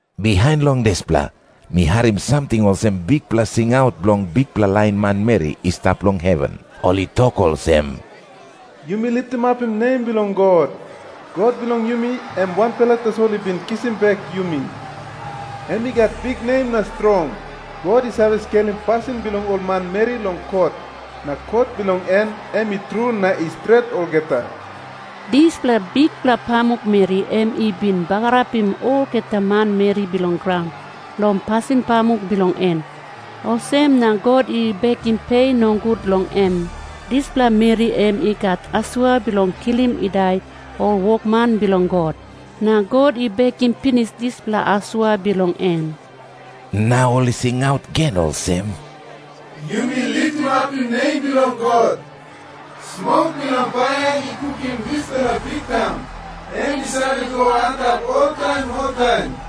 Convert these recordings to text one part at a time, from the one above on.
Bihain long dispela, mi harim samting olsem bikpela singaut bilong bikpela lain manmeri i stap long heven. Ol i tok olsem, "Yumi litimapim nem bilong God! God bilong yumi em wanpela tasol i bin kisim bek yumi. Em i gat biknem na strong. God i save skelim pasin bilong ol manmeri long kot, na kot bilong en em i tru na i stret olgeta. Dispela bikpela pamukmeri em i bin bagarapim olgeta manmeri bilong graun long pasin pamuk bilong en. Olsem na God i bekim pe nogut long em. Dispela meri em i gat asua bilong kilim i dai ol wokman bilong God, na God i bekim pinis dispela asua bilong em." Na ol i singaut gen olsem, "Yumi litimapim nem bilong God! Smok bilong paia i kukim dispela biktaun, em i save go antap oltaim oltaim!"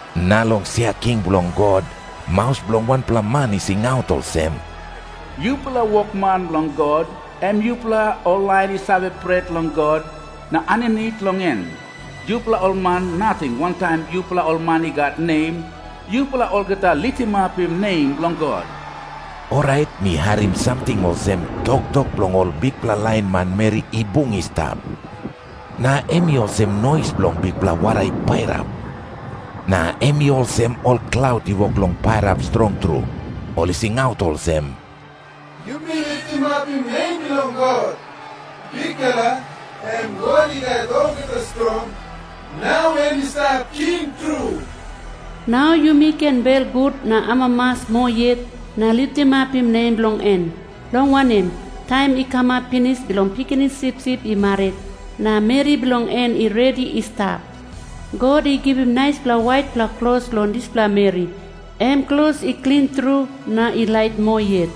Na long sia king bilong God maus bilong wanpela man i singaut olsem, "Yupela wokman bilong God, em yupela ol lain i save pret long God na aninit long en, yupela ol man nating wantaim yupela ol man i gat nem, yupela olgeta litimapim nem bilong God!" Orait mi harim samting olsem toktok bilong ol bikpela lain manmeri i bung i stap. Na em i olsem nois bilong bikpela wara i pairap. Na em i olsem ol klaut i wok long pairap strong tru. Ol i singaut olsem, "Yumi litimapim nem bilong God! Bikpela, em God I Gat Olgeta Strong, nau em i stap king tru! Nau yumi ken belgut na amamas moa yet na litimapim nem bilong en, long wanem, taim i kamap pinis bilong Pikinini Sipsip i marit, na meri bilong en i redi i stap. God i givim naispela waitpela klos long dispela meri, em klos i klin tru na i lait moa yet."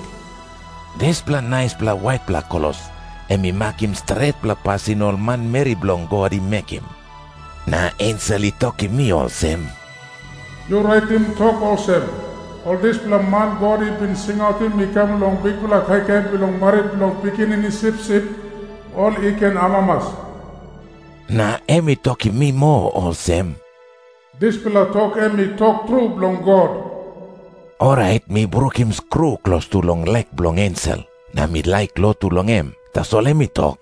Dispela naispela waitpela klos em i makim stretpela pasin ol manmeri bilong God i mekim. Na ensel i tokim mi olsem, "Yu raitim tok olsem, 'Ol dispela man God i bin singautim i kam long bikpela kaikai bilong marit bilong Pikinini Sipsip, ol i ken amamas.' " Na em i tokim mi moa olsem "Dispela tok em i tok tru bilong God." Orait mi brukim skru klostu long lek bilong ensel, na mi laik lotu long em. Tasol em i tok,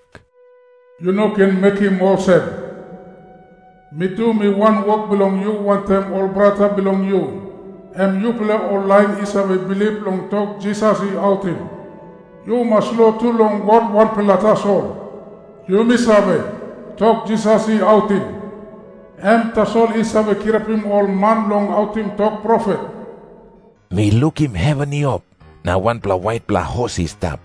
"Yu no ken mekim olsem! Mi tu mi wanwok bilong yu wantaim ol brata bilong yu, em yupela ol lain i save bilip long tok Jisas i autim. Yu mas lotu long God wanpela tasol. Yumi save, tok Jisas i autim, em tasol i save kirapim ol man long autim tok profet." Mi lukim heven i op, na wanpela waitpela hos i stap.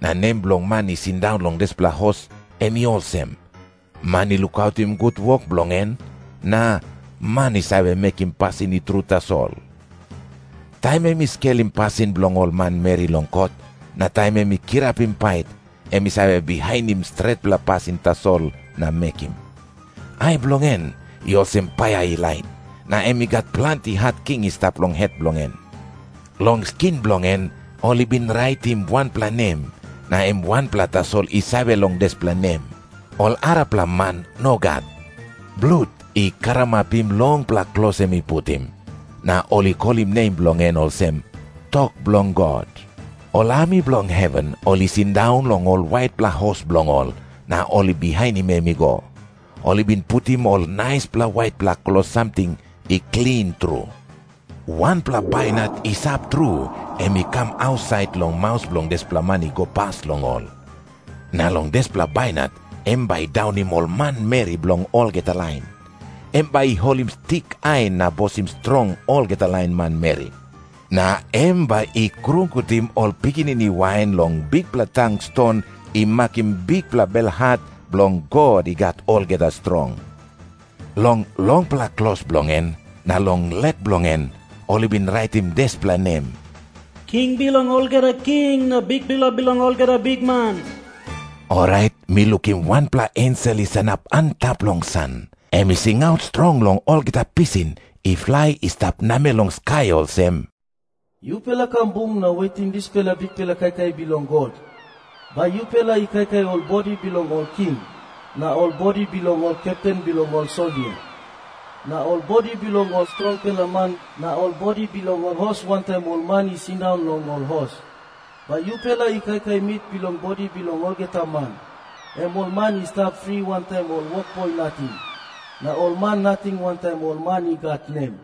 Na nem bilong man i sindaun long dispela hos, em i olsem, "Man i lukautim gut wok bilong en," na "Man i save mekim pasin i tru tasol." Taim em i skelim pasin bilong ol manmeri long kot, na taim em i kirapim pait, em i save bihainim stretpela pasin tasol na mekim. Ai bilong en i olsem paia i lait, na em i gat planti hat king i stap long het bilong en. Long skin bilong en ol i bin raitim wanpela nem, na em wanpela tasol i save long dispela nem. Ol arapela man nogat. Blut i karamapim longpela klos em i putim. Na ol i kolim nem bilong en olsem, "Tok bilong God." Ol ami bilong heven ol i sindaun long ol waitpela hos bilong ol, na ol i bihainim em i go. Ol i bin putim ol naispela waitpela klos samting i klin tru. Wanpela bainat i sap tru, em i kam ausait long maus bilong dispela man i go pas long ol. Na long dispela bainat em bai i daunim ol manmeri bilong olgeta lain. Em bai i holim stik ain na bosim strong olgeta lain manmeri. Na em bai i krungutim ol pikinini wain long bikpela tang ston i makim bikpela belhat bilong God I Gat Olgeta Strong. Long longpela klos bilong en na long lek bilong en ol i bin raitim dispela nem, "King bilong olgeta king, na Bikpela bilong olgeta bikman." Orait mi lukim wanpela ensel i sanap antap long san. Em i singaut strong long olgeta pisin i flai i stap namel long skai olsem, "Yupela kam bung na wetim dispela bikpela kaikai bilong God. Bai yupela i kaikai ol bodi bilong ol king na ol bodi bilong ol kepten bilong ol soldia na ol bodi bilong ol strongpela man na ol bodi bilong ol hos wantaim ol man i sindaun long ol hos. Bai yupela i kaikai mit bilong bodi bilong olgeta man, em ol man i stap fri wantaim ol wokboi nating na ol man nating wantaim ol man i gat nem."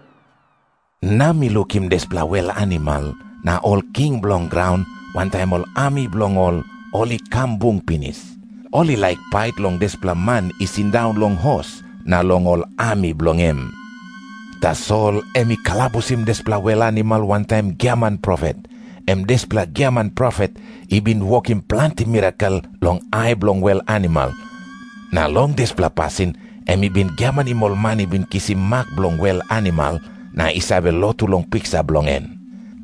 Na mi lukim dispela wel animal na ol king bilong graun, wantaim ol ami bilong ol, ol i kam bung pinis. Ol i laik pait long dispela man i sindaun long hos na long ol ami bilong em. Tasol em i kalabusim dispela wel animal wantaim giaman profet, em dispela giaman profet i bin wokim planti mirakel long ai bilong wel animal, na long dispela pasin em i bin giamanim ol man i bin kisim mak bilong wel animal na i save lotu long piksa bilong en.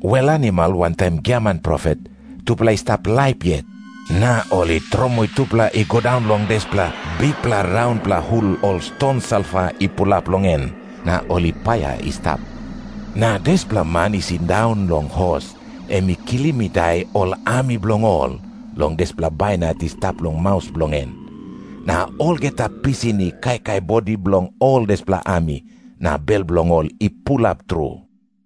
Wel animal wantaim giaman profet, tupela i stap laip yet, na ol i tromoi tupela i go daun long dispela bikpela raunpela hul ol ston salfa i pulap long en na ol i paia i stap. Na dispela man i sindaun long hos, em i kilim i dai ol ami bilong ol long dispela bainat i stap long maus bilong en. Na olgeta pisin i kaikai bodi bilong ol dispela ami, na bel bilong ol i pulap tru.